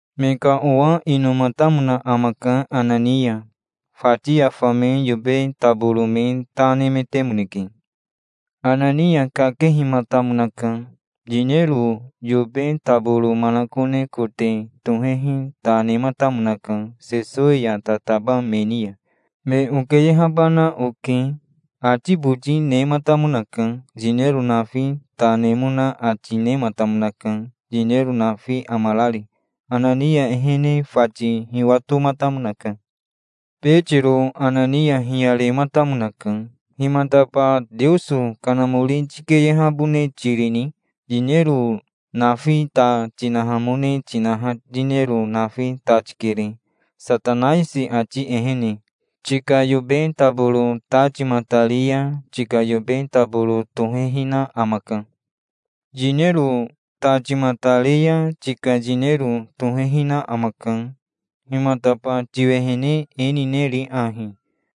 Me ka owa inomatamona amaka Anania. Fati ya fame yobe taboro me ta nemetemoneke. Anania kakehimatamonaka. Yinero yobe taboro manakone kote tohehi ta nematamonaka Sesowi ya tataba me ni ya. "Me okeyehabana oke", ati boti nematamonaka. Yinero nafi ta nemona ati nematamonaka, yinero nafi amarari. Anania ehene fati hiwatomatamonaka. Betiro Anania hiyarematamonaka. "Himataba Teoso Kanamori tikeyehabone tirini? Yinero nafi ta tinahamone tinaha yinero nafi ta tikere Satanaisi ati ehene. Tika yobe taboro ta timatari ya tika yobe taboro tohehina amaka. Yinero ta timatare ya tika yinero tohehina amaka. Himataba tiwehene e nineri ahi?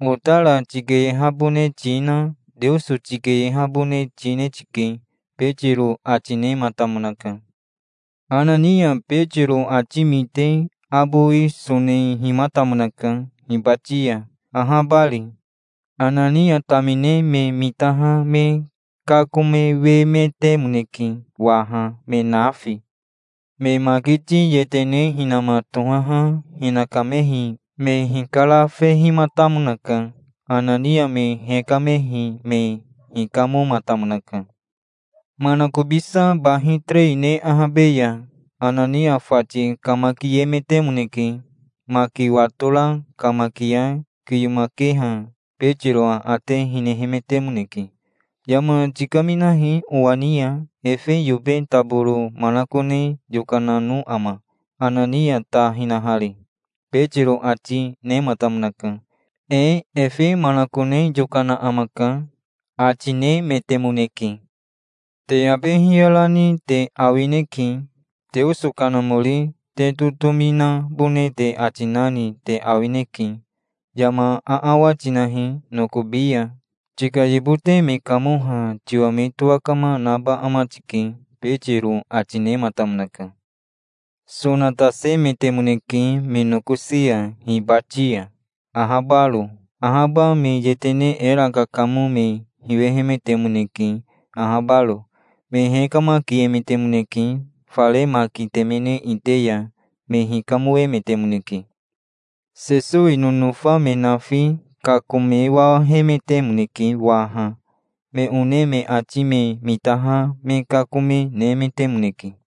Otara tikeyehabone tina Teoso tikeyehabone tine tike", Betiro ati nematamonaka. Anania Betiro ati mite abowi sonehimatamonaka hibati ya, ahabari. Anania tamine me mitaha me kakomewemetemoneke waha, me nafi. Me makiti yetene hinama tohaha hinakamehi me hikarafehimatamonaka. Anania me hekamehi me hikamomatamonaka. Manakobisa bahi terei ne ahabe ya Anania fati kamakiemetemoneke. Maki watora kamakia kiyomakeha Betiro aate hinehemetemoneke. "Yama tikaminahi owa ni ya. Efe yobe taboro manakone yokanano ama, Anania ta hinahari?" Betiro ati nematamonaka. "Ee efe manakone yokana amaka", ati nemetemoneke. "Te abe hiyarani te awineke. Teoso Kanamori te totomi nabone te ati nani te awineke. Yama aawa tinahi nokobi ya. Tika yibote me kamoha tiwa me towakama naba ama tike", Betiro ati nematamonaka. Sonatasemetemoneke me nokosi ya hibati ya, ahabaro. Ahaba me yetene era kakamo me hiwehemetemoneke ahabaro. Me hekamakiemetemoneke. Fare maki temene ite ya me hikamoemetemoneke. Sesowi nonofa me nafi kakomewahemetemoneke waha. Me one me ati me mitaha me kakome nemetemoneke.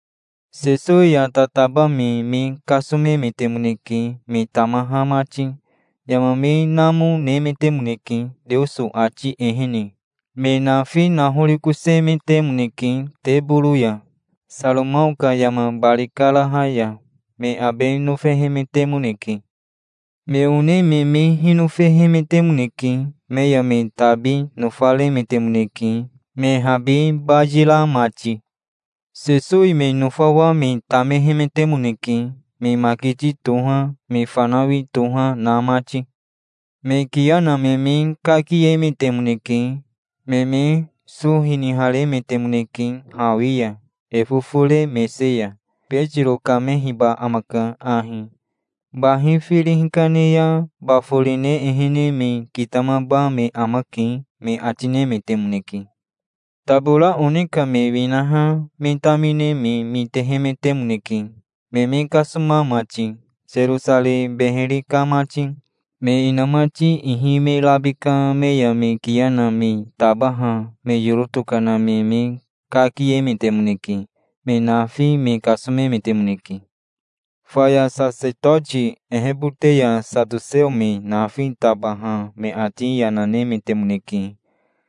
Sesowi ya tataba me me kasomemetemoneke, me tamaha mati. Yama me namo, nemetemoneke, Teoso ati ehene. Me nafi nahorikosemetemoneke teboro ya, Saromao ka yama bari karaha ya. Me abe nofehemetemoneke. Me one me me hinofehemetemoneke. Me ya me tabi nofaremetemoneke, me habi bayira mati. Sesowi me nofawa me tamehemetemoneke, me makiti toha, me fanawi toha, na mati. Me kiya na me me kakiemetemoneke. Me me so hiniharemetemoneke hawi ya, e fofore mese ya. "Betiro kamehiba amaka ahi. Bahi firi hikane ya baforine ehene me kitamaba me amake", me ati nemetemoneke. Tabora one ka me winaha me tamine me mitehemetemoneke, me me kasoma mati Serosarei beheri ka mati. Me inamati ihi me rabika me ya me kiya na me tabaha me yoro tokana me me kakiemetemoneke. Me nafi me kasomemetemoneke. Faya sasetoti ehebote ya satoseo me nafi tabaha me ati yana nemetemoneke,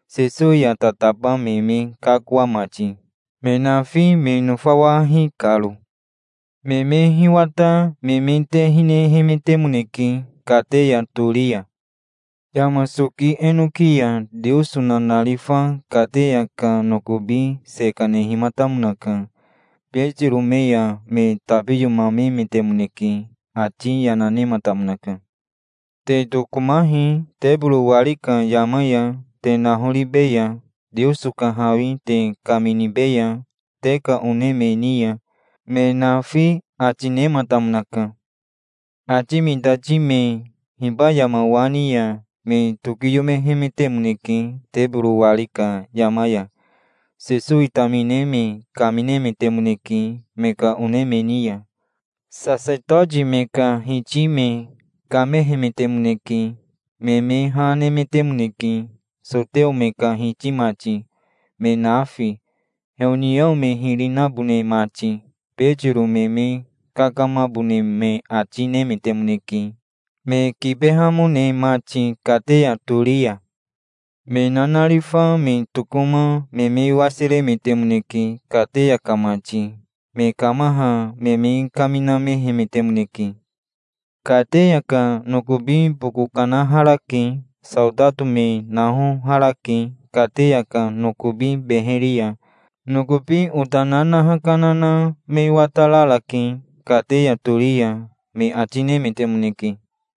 Sesowi ya tataba me me kakoa mati, me nafi me nofawahi karo. Me me hiwata me me te hinehemetemoneke kateya tori ya. Yama soki enoki ya Teoso nanarifa kateya ka nokobi se kanehimatamonaka. Betiro me ya me tabiyomamemetemoneke. Ati yana nematamonaka. "Te tokomahi. Teboro wari ka yama ya te nahoribeya. Teoso ka hawi te kaminibeya te ka one me ni ya, me nafi", ati nematamonaka. Ati mitati me hiba yama wa ni ya me tokiyomehemetemoneke teboro wari ka yama ya. Sesowi tamine me kaminemetemoneke me ka one me ni ya. Sasetoti me ka hiti me kamehemetemoneke. Me me ha nemetemoneke, soteo me ka hiti mati, me nafi, heoniao me hiri nabone mati. Betiro me me kakamabone me ati nemetemoneke, me kibehamone mati kateya tori ya. Me nanarifa me tokoma me me wasiremetemoneke kateya ka mati. Me kamaha me me kaminamehemetemoneke. "Kateya ka nokobi boko kanaharake. Saotato me nahoharake kateya ka nokobi beheri ya. Nokobi ota nanaha kana na me watararake kateya tori ya", me ati nemetemoneke.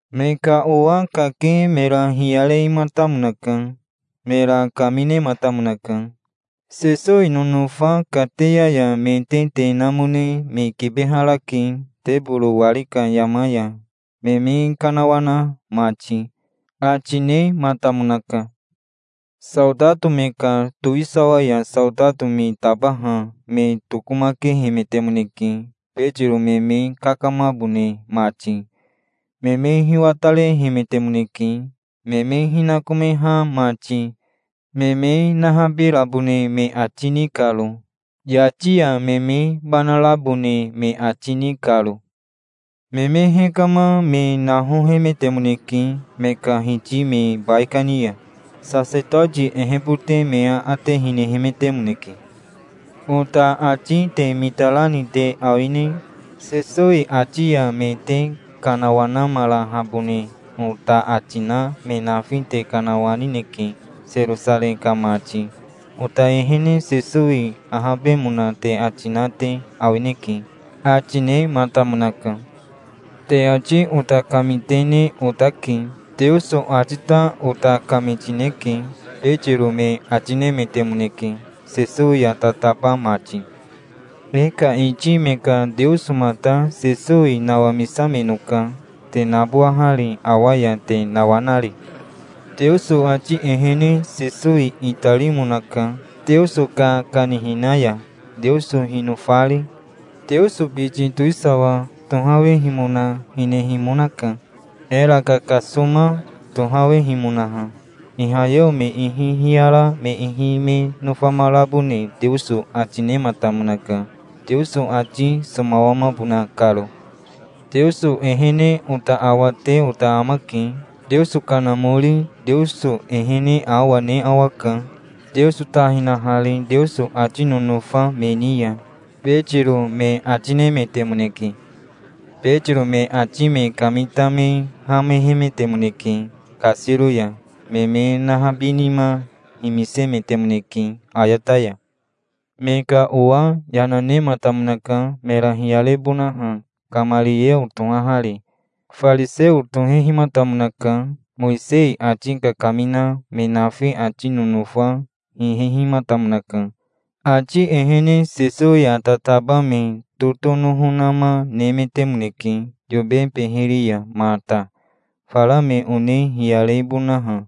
Me ka owa kake mera hiyarematamonaka. Mera kaminematamonaka. "Sesowi nonofa kateya ya me te te namone me kibeharake teboro wari ka yama ya me me kanawana mati", ati nematamonaka. Saotato me ka towisawa ya saotato me tabaha me tokomakehemetemoneke Betiro me me kakamabone mati. Me me hiwatarehemetemoneke, me me hinakomeha mati, me me nahabirabone me ati ni karo, yati ya me me banarabone me ati ni karo. Me me hekama me nahohemetemoneke me ka hiti me baikani ya. Sasetoti ehebote me aate hinehemetemoneke. "Ota ati te mitarani te awine? Sesowi ati ya me te kanawanamarahabone ota ati na me nafi te kanawanineke Serosarei ka mati. Ota ehene Sesowi ahabemona te ati na te awineke", ati nematamonaka. "Te ati ota kamitene otake. Teoso ati ta ota kamitineke", Betiro me ati nemetemoneke, Sesowi ya tataba mati. "E ka iti me ka Teosomata Sesowi nawamisamenoka, te nabowahari, awa ya te nawanari. Teoso ati ehene Sesowi itarimonaka Teoso ka kanihina ya, Teoso hinofari. Teoso biti towisawa tohawehimona hinehimonaka, era kakasoma tohawehimonaha. Ihayeo me ihi hiyara me ihi me nofamarabone Teoso ati nematamonaka, Teoso ati somawamabona karo. Teoso ehene ota awate ota amake. Teoso Kanamori Teoso ehene awa ne awaka, Teoso ta hinahari Teoso ati nonofa me ni ya", Betiro me ati nemetemoneke. Betiro me ati me kamita me hamehemetemoneke kasiro ya. Me me nahabinima himisemetemoneke ayata ya. Me ka owa yana nematamonaka mera hiyarebonaha Kamarieo tohahari. Fariseo tohehimatamonaka, Mowisei ati kakamina. Me nafi ati nonofa hihehimatamonaka. Ati ehene Sesowi ya tataba me totonoho nama nemetemoneke yobe beheri ya mata, fara me one hiyarebonaha,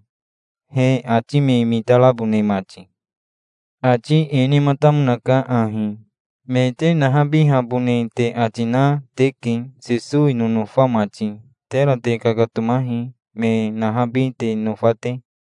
he ati me mitarabone mati. Ati e nematamonaka ahi: "Me te nahabihabone te ati na teke, Sesowi nonofa mati. Tera te kakatomahi, me nahabi te nofa te.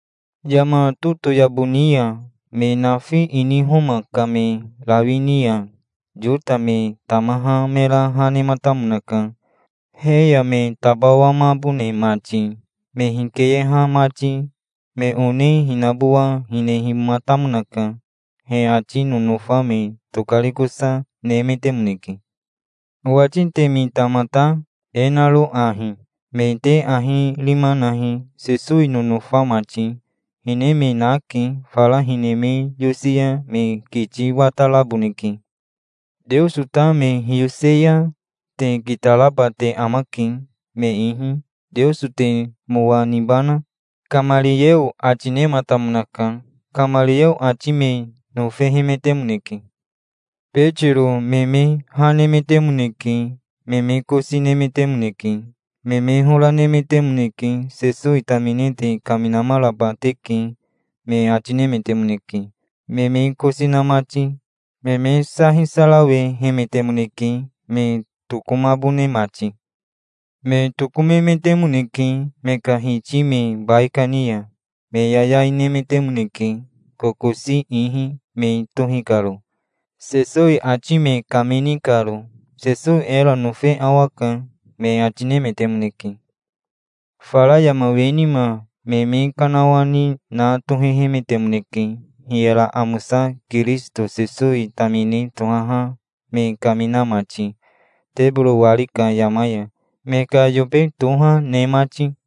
Yama totoyabo ni ya me nafi ini Homa ka me rawi ni ya Yota me tamaha mera ha nematamonaka, he ya me tabawamabone mati, me hikeyeha mati. Me one hinabowa hinehimatamonaka. He ati nonofa me tokarikosa nemetemoneke. Owati te mita mata, e naro ahi: Me te ahi rima nahi, Sesowi nonofa mati. Hine me nake. Fara hine me yosi ya me kiti wataraboneke. Teoso ta me hiyose ya te kitaraba te amake me ihi. Teoso te mowa nibana?" Kamarieo ati nematamonaka. Kamarieo ati me nofehemetemoneke. Betiro me me ha nemetemoneke. Me me kosi nemetemoneke. Me me hora nemetemoneke. "Sesowi tamine te kaminamaraba teke", me ati nemetemoneke, me me kosi na mati. Me me sa hisarawehemetemoneke, me tokomabone mati. Me tokomemetemoneke me ka hiti me baikani ya. Me yayai nemetemoneke, kokosi ihi me tohi karo, Sesowi ati me kamini karo. "Sesowi era nofe awaka", me ati nemetemoneke. Fara yama we nima me me kanawani na tohehemetemoneke, hiyara amosa Kirisito Sesowi tamine tohaha me kamina mati, teboro wari ka yama ya, me ka yobe toha, ne mati.